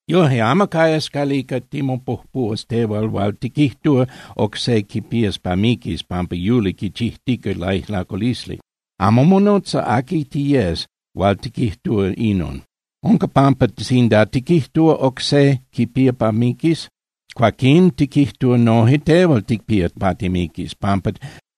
Yoje, amo cayas calica timopujpuhuas tehual hual tiquijtúa oc se quipías pa miquis pampa yuli quichijtica laijlaculisli. Amo monotza aqui tiyes hual tiquijtúa inon. Unca pampa sinda tiquijtúa oc se quipía pa miquis, cuaquín tiquijtúa noje tehual ticpía pa timiquis, pampa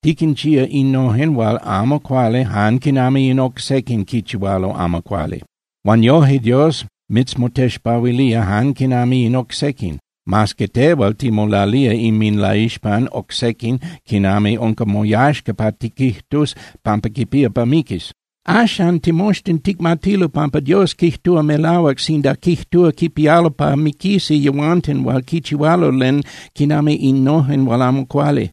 tiquinchía innojen hual amo cuali jan quinami in oc sequin quichihualo amo cuali. Huan yoje, Dios mitzmotexpahuilía jan quinami in oc sequin, mas que tehual timolalía inminlaixpan oc sequin quinami unca moyaxca pa tiquijtus pampa quipía pa miquis. Axan, timoxtin ticmatilo pampa Dios quijtúa melahuac sinda quijtúa quipialo pa miquisi yehuanten hual quinchihualo len quinami innojen hual amo cuali.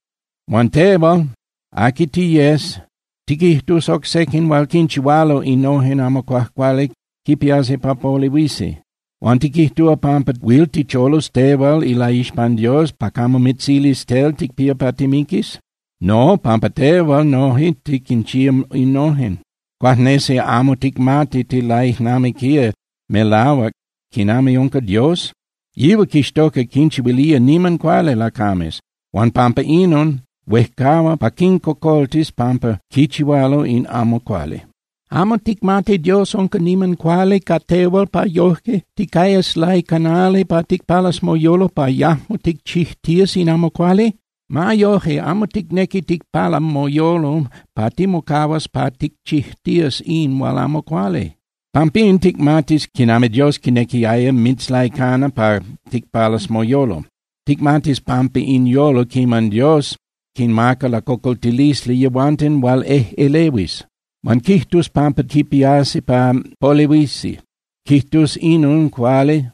Huan tehual, aqui tiyes, tiquijtus oc sequin hual quinchihualo innojen amo cuajcuali quipiasi pa polehuisi. Huan ¿tiquijtúa pampa huil ticholus tehual ilaixpan Dios pa camo mitzilis tel ticpía pa timiquis? No, pampa tehual noje tiquinchía innojen. ¿Cuajnesi amo ticmati tilaijnamiquía melahuac quinami unca Dios? Yihual quixtoca quinchihuilía niman cuali lacames. Huan pampa inon, huejcahua pa quincocoltis pampa quichihualo in amo cuali. ¿Amo ticmati Dios unca niman cuali ca tehual pa yoje ticayas laicanali pa ticpalas moyolo pa yajmo ticchijtías in amo cuali? Ma yoje, amo ticnequi ticpala moyolo pa timocahuas pa ticchijtías in hual amo cuali. Pampín ticmatis quinami Dios quinequiaya mitzlaicana pa ticpalas moyolo. Ticmatis pan in tonali quiman Dios quinmaca lacocoltilisli yehuanten hual ejꞌelehuis. Huan quijtus pampa quipiasi pa polehuisi, quijtus inon cuali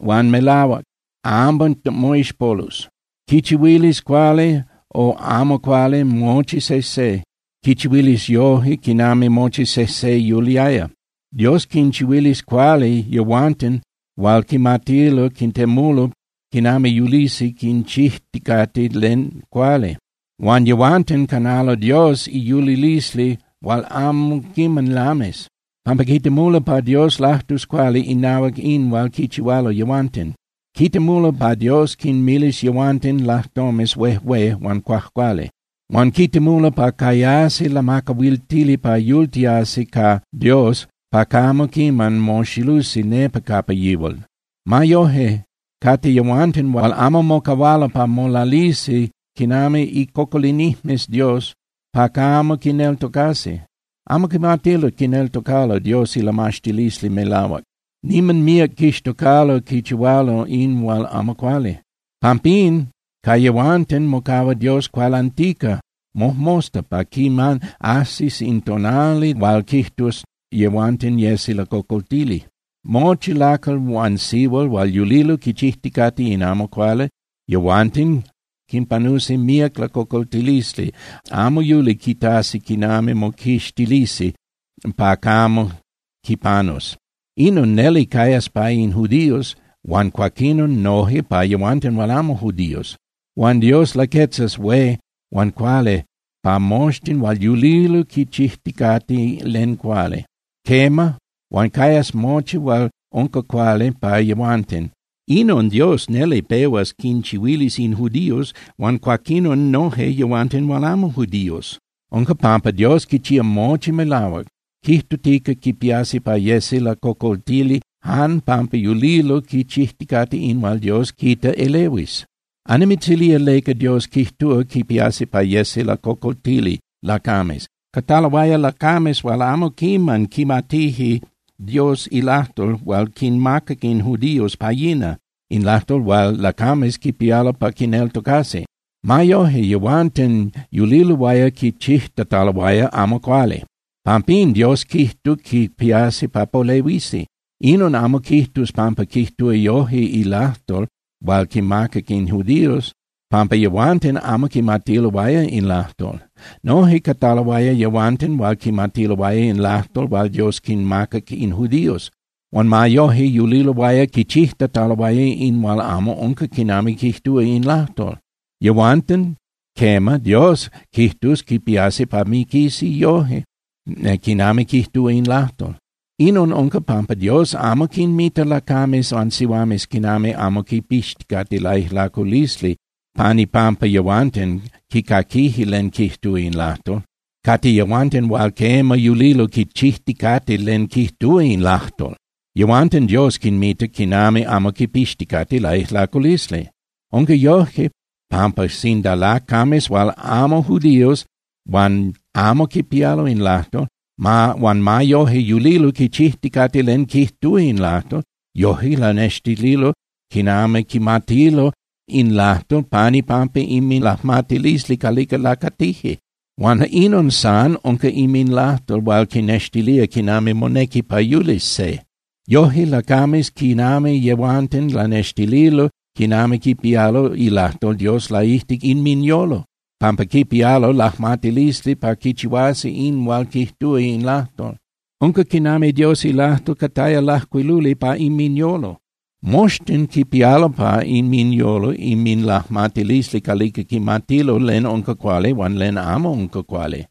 huan melahuac, amo moixpolus. Quichihuilis cuali o amo cuali mochi sejse, quichihuilis yoje quinami mochi sejse yuliaya. Dios quinchihuilis cuali yehuanten hual quimatilo quitemulo quinami yulisi quichijticate len cuali. Huan yehuanten canalo Dios iyulilisli hual amo quiman lamis, pampa quitemulo pa Dios lajtus cuali inahuac in hual quichihualo yehuanten. Quitemulo pa Dios quinmilis yehuanten lajtomes huejué huan cuajcuali. Huan quitemulo pa cayasi lamacahuiltili pa yultiasi ca Dios pa camo quiman moxilusi nepa capa yihual. Ma yoje, cate yehuanten hual amo mocahualo pa molalisi quinami icocolinijmes Dios pa camo quineltocasi. Amo quimatilo quineltocalo Dios ilamaxtilisli melahuac, niman míac quixtocalo quichihualo in hual amo cuali. Pampín ca yehuanten mocahua Dios cualantica mojmosta pa quiman ajsis in tonali hual quijtus yehuanten yesi lacocoltili. Mochi lacal huan sihual hual yulilo quichijticate in amo cuali, yehuanten quinpanusi míac lacocoltilisli, amo huil quitasi quinami moquixtilisi pa camo quinpanus. Inon neli cayas pa in judíos huan cuaquinon noje pa yehuanten hual amo judíos. Huan Dios laquetzas hué huan cuali pa moxtin hual yulilo quichijticate len cuali. Quema, huan cayas mochi hual unca cuali pa yehuanten. Inon Dios neli pehuas quinchihuilis in judíos huan cuaquinon noje yehuanten hual amo judíos. Unca pampa Dios quichía mochi melahuac, quijtutica quipiasi pa yesi lacocoltili jan pampa yulilo quichijticate in hual Dios quita elehuis. Annimitzilía leca Dios quijtúa quipiasi pa yesi lacocoltili lacames: Cataloaya lacames hual amo quiman quimatije Dios ilajtol hual quinmacac in judíos pa yina, in lajtol hual lacames quipialo pa quineltocasi. Ma yoje, yehuanten yuliloaya quichijtataloaya amo cuali. Pampín, Dios quijtus quipiasi pa polehuisi. Inon amo quijtus pampa quijtúa yoje ilajtol hual quimacac in judíos, pampa yehuanten amo quimatiloaya in lajtol. Noje cataloaya yehuanten hual quimatiloaya in lajtol hual Dios quinmacac in judíos, huan ma yoje yuliloaya quichijtataloaya in hual amo unca quinami quijtúa in lajtol. Yehuanten, quema, Dios quijtus quipiasi pa miquisi yoje quinami quijtúa in lajtol. Inon unca pampa Dios amo quinmita lacames huan sihuames quinami amo quipixticate laijlaculisli jan pampa yehuanten quicaquije len quijtúa in lajtol. Cate yehuanten hual quema yulilo quichijticate len quijtúa in lajtol, yehuanten Dios quinmita quinami amo quipixticate laijlaculisli. Unca yoje, pampa sinda lacames hual amo judíos huan amo quipía in lajtol, huan ma yoje yulilo quichijticate len quijtúa in lajtol, yoje lanextililo quinami quimatilo in lajtol pan ipampa inminlajmatilisli calica lacatije. Huan inon san unca inminlajtol hual quinnextilía quinami monequi pa yulis se. Yoje, lacames quinami yehuanten lanextililo quinami quipialo ilajtol Dios laijtic inminyolo, pampa quipialo lajmatilisli pa quichihuasi in hual quijtúa in lajtol. Unca quinami Dios ilajtol cataya lajcuiluli pa inminyolo. Moxtin quipialo pa inminyolo inminlajmatilisli calica quimatilo len unca cuali huan len amo unca cuali.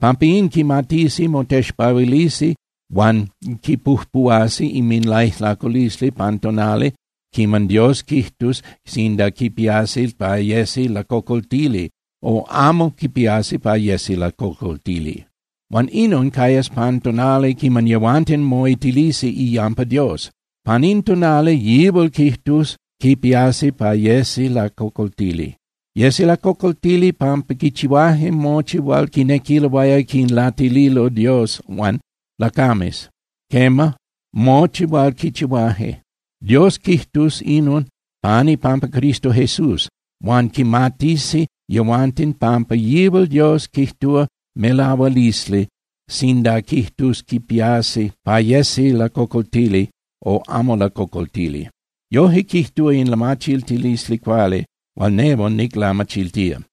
Pampín quimatisi motexpahuilisi huan quipujpuhuasi inminlaijlaculisli pan tonali quiman Dios quijtus sinda quipiasi pa yesi lacocoltili o amo quipiasi pa yesi lacocoltili. Huan inon cayas pan tonali quiman yehuanten moitilisi iyampa Dios. Pan in tonali yihual quijtus quipiasi pa yesi lacocoltili. Yesi lacocoltili pampa quichihuaje mochi hual quinequiloaya quinlatililo Dios huan lacames, quema, mochi hual quichihuaje. Dios quijtus inon pan ipampa Cristo Jesús, huan quimatisi yehuanten pampa yihual Dios quijtúa melahualisli sinda quijtus quipiasi pa yesi lacocoltili o amo lacocoltili. Yoje quijtúa in lamachiltilisli cuali hual nehual niclamachiltía.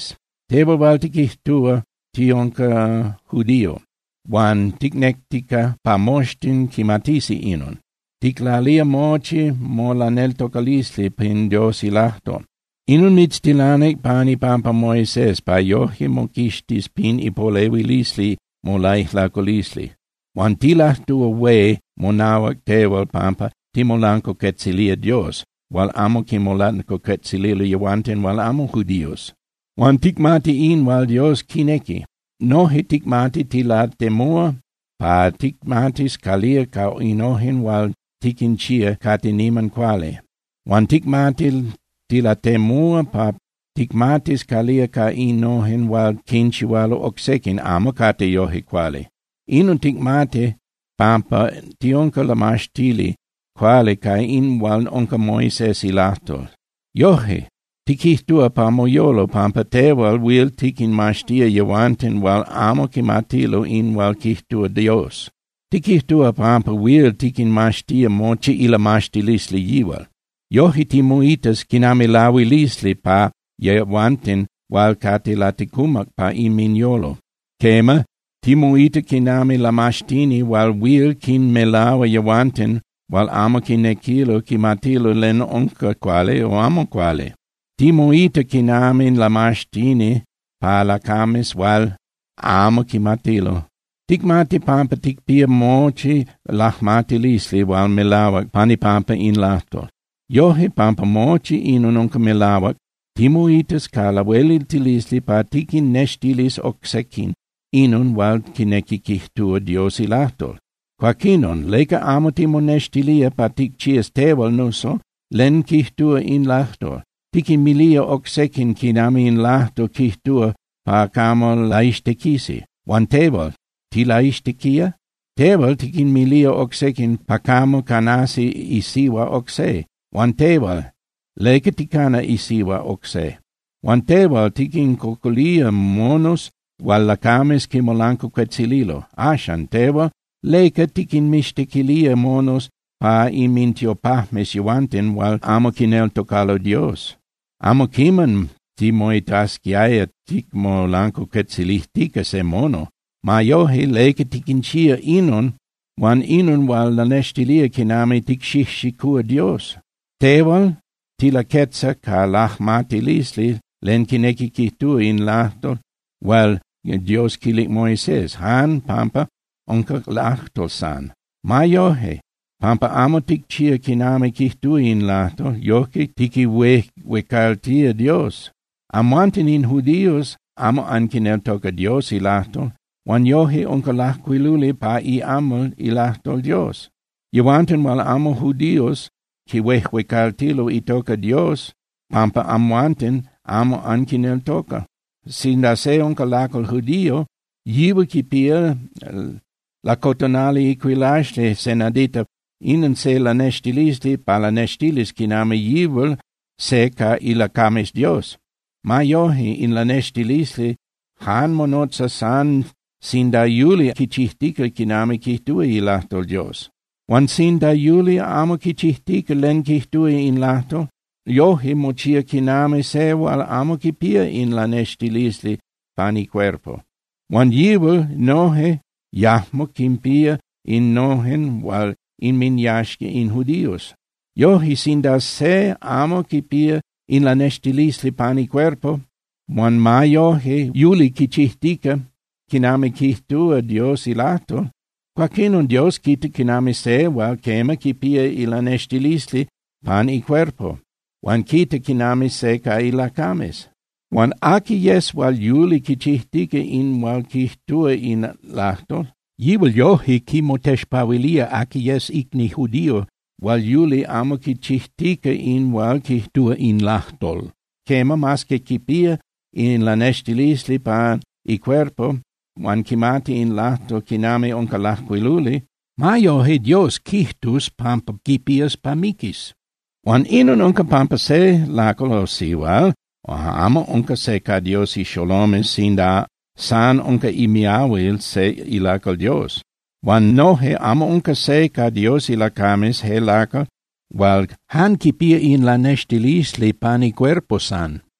Tehual hual tiquijtúa tiunca judío, huan ticnectica pa moxtin quimatisi inon, ticlalía mochi molaneltocalisli pan Dios ilajtol. Inon mitztilanic pan ipampa Moisés pa yoje timoquixtis pin ipolehuilisli molaijlaculisli. Huan tilajtúa hué monahuac tehual pampa ticmolancuacuetzilía Dios hual amo quimolancuacuetzililo yehuanten hual amo judíos. Huan ticmati in hual Dios quinequi. Noje ticmati tilatemúa pa ticmatis calía ca innojen hual tiquinchía cate niman cuali. Huan ticmati tilatemúa pa ticmatis calía ca innojen hual quinchihualo oc sequin amo cate yoje cuali. Inon ticmati pampa tiunca lamaxtili cuali ca in hual unca Moisés ilajtol. Yoje, tiquijtúa pa moyolo pampa tehual huil tiquinmaxtía yehuanten hual amo quimatilo in hual quijtúa Dios. Tiquijtúa pampa huil tiquinmaxtía mochi ilamaxtilisli yihual. Yoje timoitas quinami lahuilisli pa yehuanten hual cate laticumac pa inminyolo. Quema, timoita quinami lamaxtini hual huil quinmelahua yehuanten hual amo quinequilo quimatilo len unca cuali o amo cuali, timoita quinami lamaxtini pa lacames hual amo quimatilo. Ticmati pampa ticpía mochi lajmatilisli hual melahuac pan ipampa in lajtol. Yoje, pampa mochi inon unca melahuac, timoitas ca lahueliltilisli pa tiquinnextilis oc sequin inon hual quinequi quijtúa Dios ilajtol. Cuaquinon, ¿leca amo timonextilía pa ticchías tehual nuso len quijtúa in lajtol? Tiquinmilía oc sequin quinami in lajtol quijtúa pa camo laixtequisi. Huan tehual, ¿tilaixtequía? Tehual tiquinmilía oc sequin pa camo canasi isihua oc se. Huan tehual, ¿leca ticana isihua oc se? Huan tehual tiquincocolía monos hual lacames quinmolancuacuetzililo. Axcan tehual, ¿leca tiquinmixtequilía monos pa inmintiopajmes yehuanten hual amo quineltocalo Dios? Amo quiman timoitasquiaya ticmolancuacuetzilijtica se mono. Ma yoje, ¿leca tiquinchía inon huan inon hual lanextilía quinami ticxijxicúa Dios? Tehual tilaquetza ca lamajtilisli len quinequi quijtúa in lajtol hual Dios quilic Moisés, jan pampa unca lajtol san. Ma yoje, pampa amo ticchía quinami quijtúa in lajtol, yojque tiquihuejuecaltía Dios. Amhuanten in judíos amo anquineltoca Dios ilajtol, huan yoje unca lajcuiluli pa iamal ilajtol Dios: “Yehuanten hual amo judíos quihuejuecaltilo itoca Dios pampa amhuanten amo anquineltoca.” Sinda se unca lacal judío, yihual quipía lacotonali icuilaxli se nadita, inon se lanextilisli pa lanextilis quinami yihual se ca ilacames Dios. Ma yoje, in lanextilisli jan monotza san sinda yuli quichijtica quinami quijtúa ilajtol Dios. Huan sinda yuli amo quichijtica len quijtúa in lajtol, yoje mochía quinami se hual amo quipía in lanextilisli pan icuerpo. Huan yihual noje yajmo quinpía innojen hual inminyaxca in judíos. Yoje, sinda se amo quipía in lanextilisli pan icuerpo, huan ma yoje yuli quichijtica quinami quijtúa Dios ilajtol, cuaquinon Dios quita quinami se hual quema, quipía ilanextilisli pan icuerpo huan quita quinami se ca ilacames. Huan aqui yes hual yuli quichijtica in hual quijtúa in lajtol, yihual yoje quimotexpahuilía aqui yes icni judío hual yuli amo quichijtica in hual quijtúa in lajtol. Quema, mas que quipía in lanextilisli pan icuerpo huan quimati in lajtol quinami unca lajcuiluli, ma yoje Dios quijtus pampa quipías pa miquis. Huan inon unca pampa se lacal o sihual amo unca se ca Dios ixolomes sinda san unca imiahuil se ilacal Dios. Huan noje amo unca se ca Dios ilacames je lacal hual jan quipía in lanextilisli pan icuerpo san.